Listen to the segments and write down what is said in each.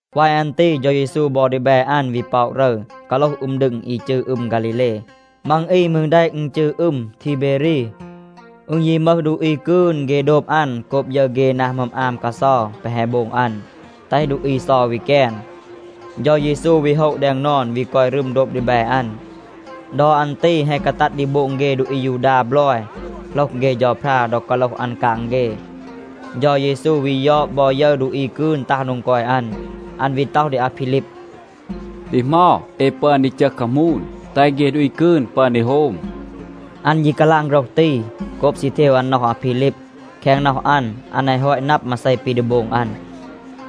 วาย อัน ตี เฌา เยซู บอ ดีแบ อัน วี ป็อะ รึร, กาโลห อึม ดึง อี จืร อึม ฆาลีเล. (มัง อี มืร แดะ อึณ จืร อึม ทีเบรี). อึณ ยี มึห ดูอี กืน, เฆ โดบ อัน โกบ ยึร เฆ นา หมึอม อาม กาเซา แปะ แฮะ โบง อัน, แตห ดูอี เซา วี แกน. เฌา เยซู วี โฮะ แดง นอน, วี กอย รึม โดบ ดีแบ อัน. ดอ อัน ตี แฮะ กาตัด ดี โบง เฆ ดูอี อายูดา บลอย โหลห เฆ เฌาพรา ดอ กาโลห อัน กาง เฆ. เฌา เยซู วี ยอด บอ ยึร ดูอี กืน ตัห โดง กอย อัน. อัน วี ต็อห ดี อาพีลีบ, “ดี เหมา เอ ปึอน ดี จึห คามูน, แตห เฆ ดูอี กืน ปึอน ดี โฮม?” อัน ยี กาลาง โฆรห ตี, โกบ ซี เทว อัน น็อห อาพีลีบ. แคง น็อห อัน, อัน แฮะ ฮอต นับ มาเซ ปี ดี โบง อัน.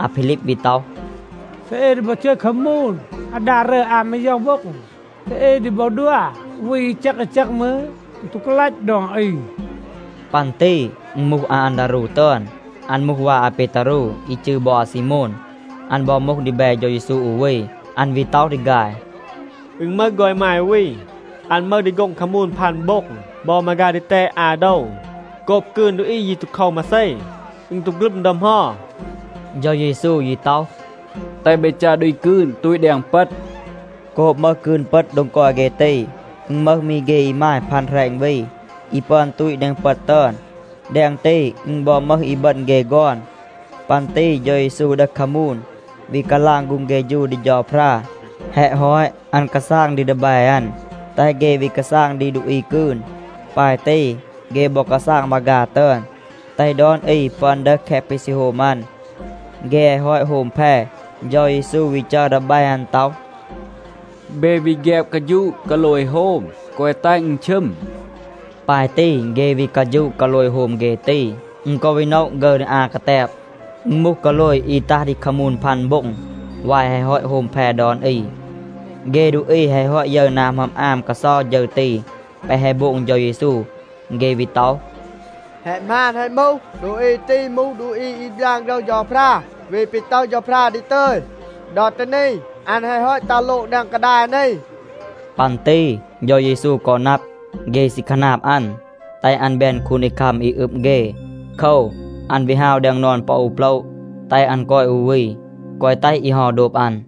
อาพีลีบ วี ต็อห, “เซ เอ ดี บอ จึห คามูน อาดา รึอน อา มาย็อห โบ็ง,a เซ เอ ดี บอ ดัว อู วี อี แจก อี แจก มืร, อึณ ตู กาลัต ดอน อี.” ปัน ตี อึณ มูห อาอันดารู ตึอน. อัน มูห วา อาเปตารู อี จืร บอ อาซีโมน. อัน บอ มูห ดีแบ เฌา เยซู อู วี. อัน วี ต็อห ดี ฆาย, “อึณ มึห ฆอน อีมาย อู วี. อัน มึห ดี โฆ็ง คามูน พัน โบ็ง บอ มาฆา ดีแตด อา โดว. โกบ กืน ดูอี ยี ตู โคว มาเซ. อึณ ตู ฆลึม ดอ เหมา.” เฌา เยซู ยี ต็อห, “แตห เบ จัร ดูอี กืน ตูต แดง เปต.” โกบ มึห กืน เปต โดง กอย เฆ ตี, อึณ มึห มี เฆ อีมาย พัน แหรณ วี, อี ปึอน ตูต แดง เปต ตึอน. แดง ตี, อึณ บอ มึห บอ อีบึณ เฆ ฆอน. ปัน ตี เฌา เยซู ดึห คามูน, วี กาลาง ฆูง เฆฌู ดี เฌาพรา. แฮะ ฮอต, อัน กาซาง ดี ดีแบ อัน, แตห เฆ วี กาซาง ดี ดูอี กืน. ปาย ตี เฆ บอ กาซาง มาฆา ตึอน, แตห ดอน อี ปึอน ดึห แคะ ปี ซี โฮม อัน. เฆ แฮะ ฮอต โฮม แพ, เฌา เยซู วี จัร ดีแบ อัน ต็อห, “เบ วี แฆบ กาฌูะ กาโลย โฮม. แกวะ แตห อึณ ชึม.” ปาย ตี เฆ วี กาฌูะ กาโลย โฮม เฆ ตี. อึณ กอ วี โนะ ฆึร ดี อา กาแตบ. อึณ มูห กาโลย อี ตัห ดี คามูน พัน โบ็ง วาย แฮะ ฮอต โฮม แพ ดอน อี. เฆ ดูอี แฮะ ฮอต ยึร นา หมึอม อาม กาเซา ฌึร ตี แปะ แฮะ โบง เฌา เยซู, เฆ วี ต็อห, “แฮะ หมาน, แฮะ มูห. ดูอี ตี มูห ดูอี อี บยาน โฆรห เฌาพรา, วี ปี ต็อห เฌาพรา ดี ตึย. ดอ ตี นี อัน แฮะ ฮอต ตัห โลง แดง กาดาย นี.” ปัน ตี เฌา เยซู กอ นับ, เฆ ซี คาหนาบ อัน, แตห อัน แบน คูนดีคัม อี อึบ เฆ. โคว, อัน วี ฮาว แดง นอน ปอ อู โปละ, แตห อัน กอย อู วี, แกวะ แตห อี เฮา โดบ อัน.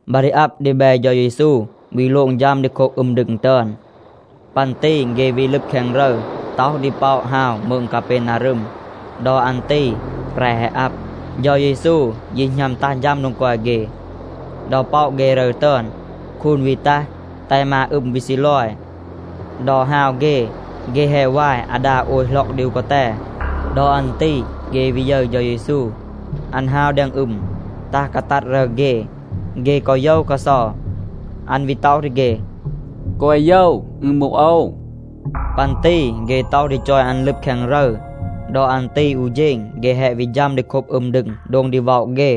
บา ดี อับ ดีแบ เฌา เยซู วี โลง ฌัม ดี โคบ อึม ดึง ตึอน. ปัน ตี เฆ วี ลึบ แคง รึร, ต็อห ดี ป็อะ ฮาว มืง กาเปนารึม. ดอ อัน ตี แปร แฮะ อับ. เฌา เยซู ยี หณัม ตัห ฌัม โดง กอย เฆ. ดอ ป็อะ เฆ รึร ตึอน, คูน วี ตัห, แตห มา อึม วี ซีลอย. ดอ ฮาว เฆ, เฆ แฮะ วาย อาดา โอย หล็อก ดี อู กาแต.b ดอ อัน ตี เฆ วี ยึร เฌา เยซู. อัน ฮาว แดง อึม, ตัห กาตัด รึร เฆ. เฆ กอ โยว กาเซา. อัน วี ต็อห ดี เฆ, “แกวะ โยว, อึณ มูห โอว.” ปัน ตี เฆ ต็อห ดี จอย อัน ลึบ แคง รึร. ดอ อัน ตี อู เฌณ เฆ แฮะ วี ฌัม ดี โคบ อึม ดึง, โดง ดี ว็อะ เฆ.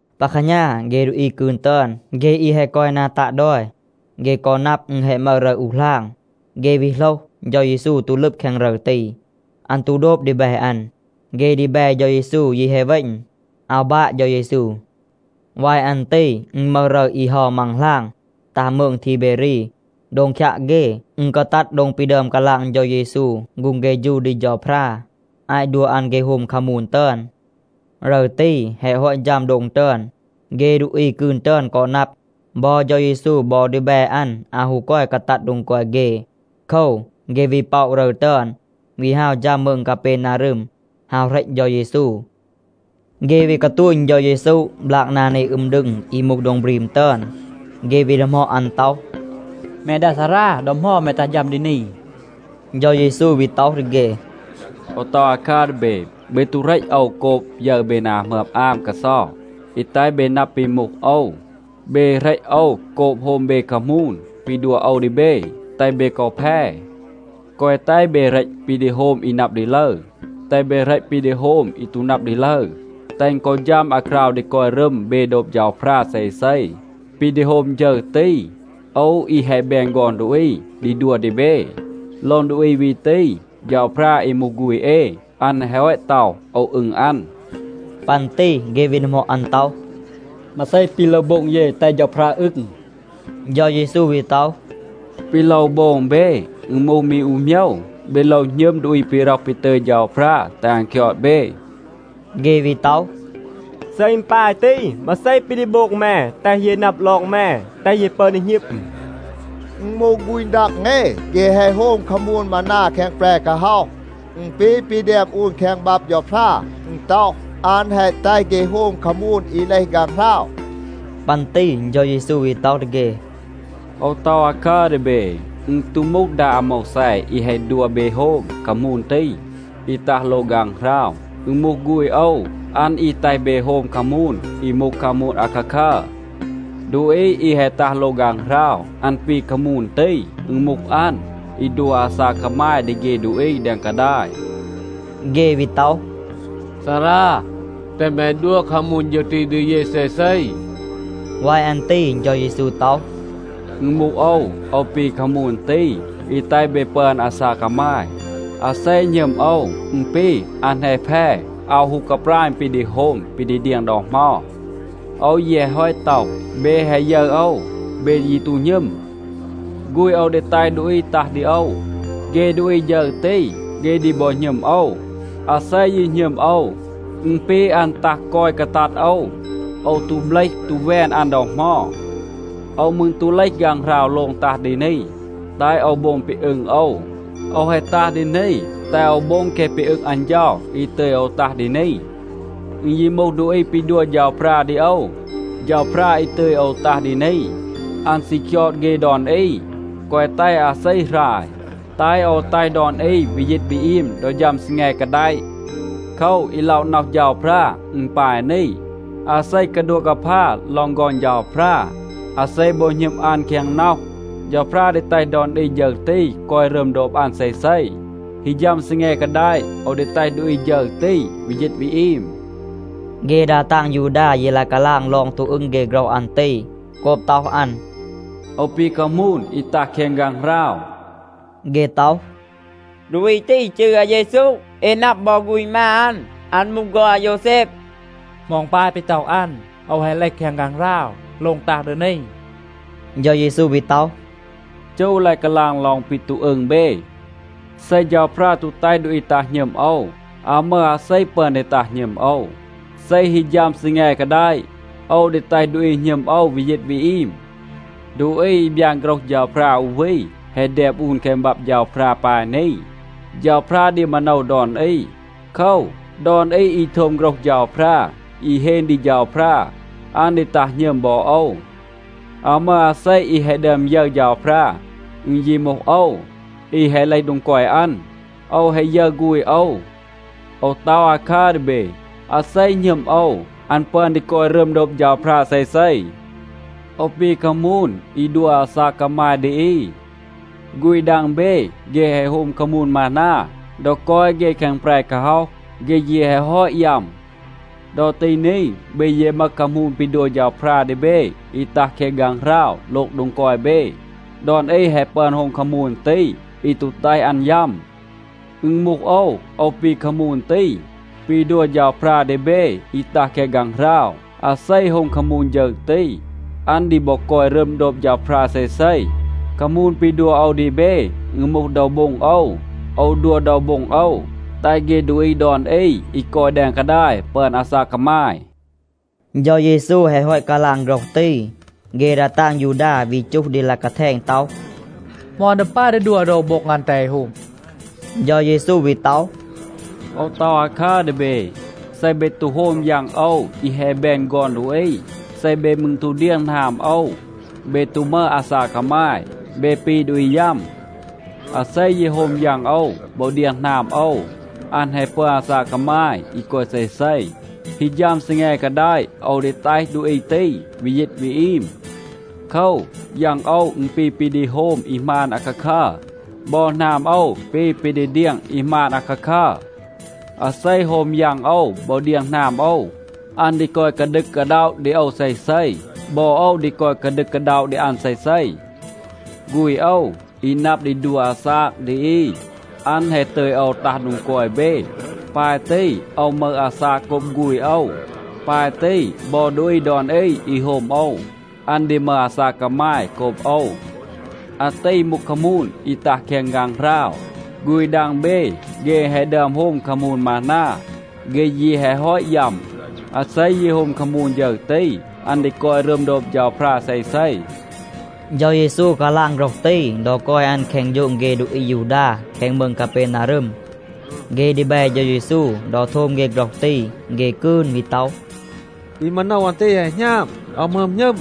ปา แคหณา, เฆ ดูอี กืน ตึอน, เฆ อี แฮะ กอย นา ตัะ ดอย, เฆ กอ นับ อึณ แฮะ มึห มี รึร อู หลาง. เฆ วี โหลห, เฌา เยซู ตู ลึบ แคง รึร ตี. อัน ตู โดบ ดีแบ อัน. เฆ ดีแบ เฌา เยซู ยี แฮะ เวณ, อาว บาะ เฌา เยซู. วาย อัน ตี อึณ มึห รึร อี เฮา มัง หลาง ตัห มืง ทีเบรี. โดง คยัะ เฆ, อึณ กาตัด โดง ปี ดึอม กาลาง เฌา เยซู ฆูง เฆฌู ดี เฌาพรา, อาต ดัว อัน เฆ โฮม คามูน ตึอน. รึร ตี แฮะ ฮอต ฌัม โดง ตึอน, เฆ ดูอี กืน ตึอน กอ นับ, บอ เฌา เยซู บอ ดีแบ อัน อาว ฮู กอย กาตัด โดง กอย เฆ. โคว, เฆ วี ป็อะ รึร ตึอน, วี ฮาว ฌัม มืง กาเปนารึม, ฮาว เหรต เฌา เยซู. เฆ วี กาตูณ เฌา เยซู บลาก นา นี อึม ดึง อี มูห โดง บรีม ตึอน. เฆ วี ดีหมอด อัน ต็อห, “แม ดา ซารา, ดอ เหมา แม ตัห ฌัม ดี นี?” เฌา เยซู วี ต็อห ดี เฆ, “โอว ต็อห อาคัร ดี เบ. เบ ตู เหรต โอว โกบ ยึร เบ นา หมึอม อาม กาเซา อี แตห เบ นับ ปี มูห โอว. เบ เหรต โอว โกบ โฮม เบ คามูน ปี ดัว โอว ดี เบ, แตห เบ กอ แพ. แกวะ แตห เบ เหรต ปี ดี โฮม อี นับ ดี ลึร. แตห เบ เหรต ปี ดี โฮม อี ตู นับ ดี ลึร, แตห อึณ กอ ฌัม อาคราว ดี กอย รึม เบ โดบ เฌาพรา เซเซ. ปี ดี โฮม ฌึร ตี, โอว อี แฮะ แบน ฆอน ดูอี ดี ดัว ดี เบ. ลอง ดูอี วี ตี เฌาพรา อี มูห ฆูณ เอ, อัน แฮะ ฮอต ต็อห, ‘โอว อึง อัน.’” ปัน ตี เฆ วี ดีหมอด อัน ต็อห, “มาเซ ปี โลว โบง เย, แตห เฌาพรา อึง?” เฌา เยซู วี ต็อห, “ปี โลว โบง เบ, อึณ มูห มี อู โมยว. เบ โลว หณึม ดูอี ปี ร็อห ปี ตึย เฌาพรา แตห อัน คยอด เบ.” เฆ วี ต็อห, “เซ อึณ ปาย ตี, มาเซ ปี ดี โบง แม, แตห เย นับ ลอง แม, แตห เย ปึอน ดี หณึม? อึณ มูห ฆูณ ดัง เอ, เฆ แฮะ โฮม คามูน มานา แคง แปร กาฮ็อห. อึณ ปี ปี แดม อูน แคง บับ เฌาพรา. อึณ ต็อห, ‘อัน แฮะ แตห เฆ โฮม คามูน อี เลห ฆางหราว.’” ปัน ตี เฌา เยซู วี ต็อห ดี เฆ, “โอว ต็อห อาคัร ดี เบ, อึณ ตู มูห ดา อาโมวแซ อี แฮะ ดัว เบ โฮม คามูน ตี, อี ตัห โลง ฆางหราว. อึณ มูห ฆูณ โอว. อัน อี แตห เบ โฮม คามูน อี มูห คามูน อาคาคัร. ดูอี อี แฮะ ตัห โลง ฆางหราว, อัน ปี คามูน ตี. อึณ มูห อัน, อี ดัว อาซาก กามาย ดี เฆ ดูอี แดง กาดาย.” เฆ วี ต็อห, “ซารา, แตห แม ดัว คามูน ฌึร ตี ดี เย เซเซ.” วาย อัน ตี เฌา เยซู ต็อห, “อึณ มูห โอว. โอว ปี คามูน ตี, อี แตห เบ ปึอน อาซาก กามาย. อาเซ หณึม โอว, อึณ ปี, อัน แฮะ แพ, อาว ฮู กาปราณ ปี ดี โฮม ปี ดี เดียง ดอ เหมา. โอว ยี แฮะ ฮอต ต็อห, เบ แฮะ ยึร โอว, เบ ยี ตู หณึม. ฆูณ โอว ดี แตห ดูอี ตัห ดี โอว. เฆ ดูอี ฌึร ตี, เฆ ดี บอ หณึม โอว. อาเซ ยี หณึม โอว, อึณ ปี อัน ตัห กอย กาตัด โอว. โอว ตู เบลห ตู แวน อัน ดอ เหมา. โอว มืร ตู เลห ฆางหราว โลง ตัห ดี นี, แตห โอว โบง ปี อึง โอว. โอว แฮะ ตัห ดี นี, แตห โอว โบง แคะ ปี อึง อัน เฌา อี ตึย โอว ตัห ดี นี. อึณ ยี มูห ดูอี ปี ดัว เฌาพรา ดี โอว, เฌาพรา อี ตึย โอว ตัห ดี นี, อัน ซี คยอด เฆ ดอน อี, แกวะ แตห อาเซ หราย, แตห โอว แตห ดอน อี วี ยีต วี อีม ดอ ฌัม ซีแง กาแดะ. โคว, อี ล็อะ น็อห เฌาพรา, อึณ ปาย นี. อาเซ กาดัวะ กาพา ลอง ฆอน เฌาพรา, อาเซ บอ หณึม อัน แคง น็อห, เฌาพรา ดี แตห ดอน อี ฌึร ตี กอย รึม โดบ อัน เซเซ. ฮี ฌัม ซีแง กาแดะ, โอว ดี แตห ดูอี ฌึร ตี วี ยีต วี อีม.” เฆ ดา ตาง ยูดา ยี ลาย กาลาง ลอง ตู อึง เฆ โฆรห อัน ตี, โกบ ต็อห อัน, “โอว ปี คามูน อี ตัห แคง ฆางหราว.” เฆ ต็อห, “ดูอี ตี จืร อาเยซู. เอ นับ บอ ฆูณ มา อัน. อัน มูห ฆอน อาโยวแซบ. เหมา อึณ ปาย ปี ต็อห อัน, ‘โอว แฮะ เลห แคง ฆางหราว, โลง ตัห ดี นี?’” เฌา เยซู วี ต็อห, “จู ลาย กาลาง ลอง ปี ตู อึง เบ. เซ เฌาพรา ตู แตห ดูอี ตัห หณึม โอว, อาว มึห อาเซ ปึอน ดี ตัห หณึม โอว. เซ ฮี ฌัม ซีแง กาแดะ, โอว ดี แตห ดูอี หณึม โอว วี ยีต วี อีม. ดูอี อี บยาน โฆรห เฌาพรา อู วี แฮะ แดม อูน แคง บับ เฌาพรา ปาย นี, ‘เฌาพรา ดี มาโนว ดอน อี.’ โคว, ดอน อี อี โทม โฆรห เฌาพรา, อี เฮน ดี เฌาพรา, อัน ดี ตัห หณึม บอ โอว. อาว มึห อาเซ อี แฮะ ดึอม ยึร เฌาพรา. อึณ ยี มูห โอว, อี แฮะ เลห โดง กอย อัน, โอว แฮะ ยึร ฆูณ โอว. โอว ต็อห อาคัร ดี เบ, อาเซ หณึม โอว, อัน ปึอน ดี กอย รึม โดบ เฌาพรา เซเซ. โอว ปี คามูน อี ดัว อาซาก กามาย ดี อี. ฆูณ ดัง เบ, เฆ แฮะ โฮม คามูน มานา, ดอ กอย เฆ แคง แปร กาฮ็อห. เฆ ยี แฮะ ฮอต ยัม. ดอ ตี นี เบ ยี มึห คามูน ปี ดัว เฌาพรา ดี เบ อี ตัห แคง ฆางหราว โลง โดง กอย เบ. ดอน อี แฮะ ปึอน โฮม คามูน ตี อี ตู แตห อัน ยัม. อึณ มูห โอว, โอว ปี คามูน ตี ปี ดัว เฌาพรา ดี เบ อี ตัห แคง ฆางหราว. อาเซ โฮม คามูน ฌึร ตี, อัน ดี บอ กอย รึม โดบ เฌาพรา เซเซ. คามูน ปี ดัว โอว ดี เบ, อึณ มูห โดว โบ็ง โอว. โอว ดัว โดว โบ็ง โอว, แตห เฆ ดูอี ดอน อี อี กอย แดง กาดาย ปึอน อาซาก กามาย.” เฌา เยซู แฮะ ฮอต กาลาง โฆรห ตี, เฆ ดา ตาง ยูดา วี จูห ดี ลาย กาแทณ ต็อห, “เหมา อัน ดี ปาย ดี ดัว โดว โบ็ง อัน, แตห เอ โฮม?” เฌา เยซู วี ต็อห, “โอว ต็อห อาคัร ดี เบ, เซ เบ ตู โฮม ยัง โอว อี แฮะ แบน ฆอน ดูอี, เซ เบ มืร ตู เดียง หนาม โอว, เบ ตู มึห อาซาก กามาย. เบ ปี ดูอี ยัม. อาเซ ยี โฮม ยัง โอว บอ เดียง หนาม โอว, อัน แฮะ ปึอน อาซาก กามาย อี กอย เซเซ. ฮี ฌัม ซีแง กาแดะ, โอว ดี แตห ดูอี ตี วี ยีต วี อีม. โคว, ยัง โอว, อึณ ปี ปี ดี โฮม อี หมาน อาคาคัร. บอ หนาม โอว ปี ปี ดี เดียง อี หมาน อาคาคัร. อาเซ โฮม ยัง โอว บอ เดียง หนาม โอว, อัน ดี กอย กาดึก กาด็อะ ดี โอว เซเซ. บอ โอว ดี กอย กาดึก กาด็อะ ดี อัน เซเซ. ฆูณ โอว, อี นับ ดี ดัว อาซาก ดี อี, อัน แฮะ ตึย โอว ตัห โดง กอย เบ. ปาย ตี โอว มึห อาซาก โกบ ฆูณ โอว. ปาย ตี บอ ดูอี ดอน อี อี โฮม โอว, อัน ดี มึห อาซาก กามาย โกบ โอว. อาตี มูห คามูน อี ตัห แคง ฆางหราว. ฆูณ ดัง เบ, เฆ แฮะ ดึอม โฮม คามูน มานา. เฆ ยี แฮะ ฮอต ยัม. อาเซ ยี โฮม คามูน ฌึร ตี, อัน ดี กอย รึม โดบ เฌาพรา เซเซ.” เฌา เยซู กาลาง โฆรห ตี ดอ กอย อัน แคง โฌง เฆ ดูอี อายูดา แคง มืง กาเปนารึม. เฆ ดีแบ เฌา เยซู, ดอ โทม เฆ โฆรห ตี, เฆ กืน วี ต็อห, “ปี มาโนว อัน ตี แฮะ หณาบ, อาว หมึอม หณึม.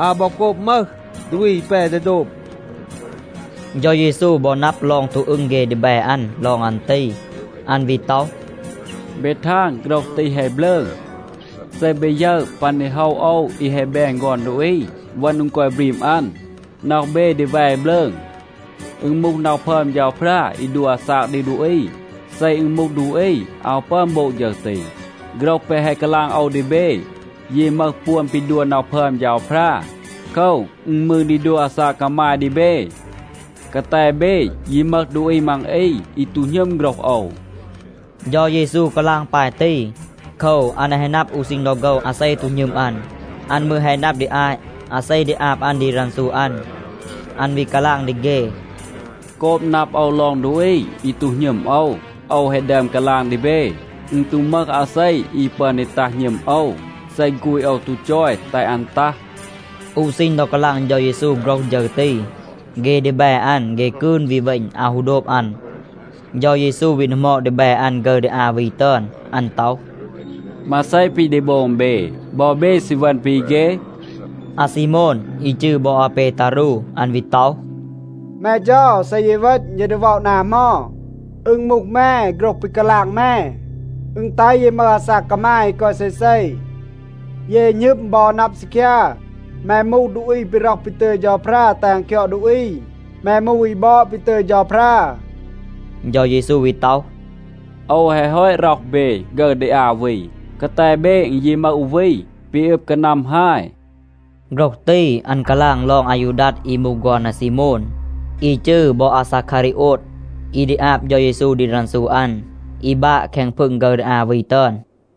อาว บอ โกบ มึห ดูอี อี แป ดี โดบ.” เฌา เยซู บอ นับ ลอง ตู อึง เฆ ดีแบ อัน ลอง อัน ตี. อัน วี ต็อห, “เบ ทาง โฆรห ตี แฮะ บลืง. เซ เบ ยึร ปัน ดี โฮะ โอว อี แฮะ แบน ฆอน ดูอี เวณ โดง กอย บรีม อัน, น็อห เบ ดี แว บลืง. อึณ มูห น็อห พึอม เฌาพรา อี ดัว อาซาก ดี ดูอี. เซ อึณ มูห ดูอี, อาว ปึอน โบง ฌึร ตี. โฆรห แปะ แฮะ กาลาง โอว ดี เบ ยี มึห ปวน ปี ดัว น็อห พึอม เฌาพรา. โคว, อึณ มืร ดี ดัว อาซาก กามาย ดี เบ. กาแต เบ, ยี มึห ดูอี มัง อี อี ตู หณึม โฆรห โอว.” เฌา เยซู กาลาง ปาย ตี, โคว, อัน แฮะ นับ อู ซีณ ดอ โฆว อาเซ ตู หณึม อัน. อัน มืร แฮะ นับ ดี อาต อาเซ ดี อาบ อัน ดี รันซู อัน. อัน วี กาลาง ดี เฆ, “โกบ นับ โอว ลอง ดูอี อี ตู หณึม โอว, โอว แฮะ ดึอม กาลาง ดี เบ, อึณ ตู มึห อาเซ อี ปึอน ดี ตัห หณึม โอว, เซ ฆูณ โอว ตู จอย แตห อัน ตัห.” อู ซีณ ดอ กาลาง เฌา เยซู โฆรห ฌึร ตี, เฆ ดีแบ อัน, เฆ กืน วี เวณ, อาว ฮู โดบ อัน. เฌา เยซู วี ดีหมอด ดีแบ อัน ฆึร ดี อา วี ตึอน, อัน ต็อห, “มาเซ ปี ดี โบง เบ? บอ เบ ซี เวณ ปี เฆ?” อาซีโมน, อี จืร บอ อาเปตารู, อัน วี ต็อห, “แม เฌา, เซ เย เวณ, เย ดี วี ว็อะ นา เหมา? อึณ มูห แม, โฆรห ปี กาลาง แม, อึณ แตห เย มึห อาซาก กามาย อี กอย เซเซ.” เย หณึม บอ นับ ซีคยา, แม มูห ดูอี ปี ร็อห ปี ตึย เฌาพรา แตห อัน คยอด ดูอี. แม มูห อี บอด ปี ตึย เฌาพรา. เฌา เยซู วี ต็อห, “โอว แฮะ ฮอต ร็อห เบ ฆึร ดี อา วี. กาแต เบ อึณ ยี มึห อู วี ปี อึบ กานัม ฮาย.” โฆรห ตี อัน กาลาง ลอง อายูดัด อี มูห ฆอน อาซีโมน, อี จืร บอ อาซาคารีโอด, อี ดี อาบ เฌา เยซู ดี รันซู อัน, อี บาะ แคง พึง ฆึร ดี อา วี ตึอน.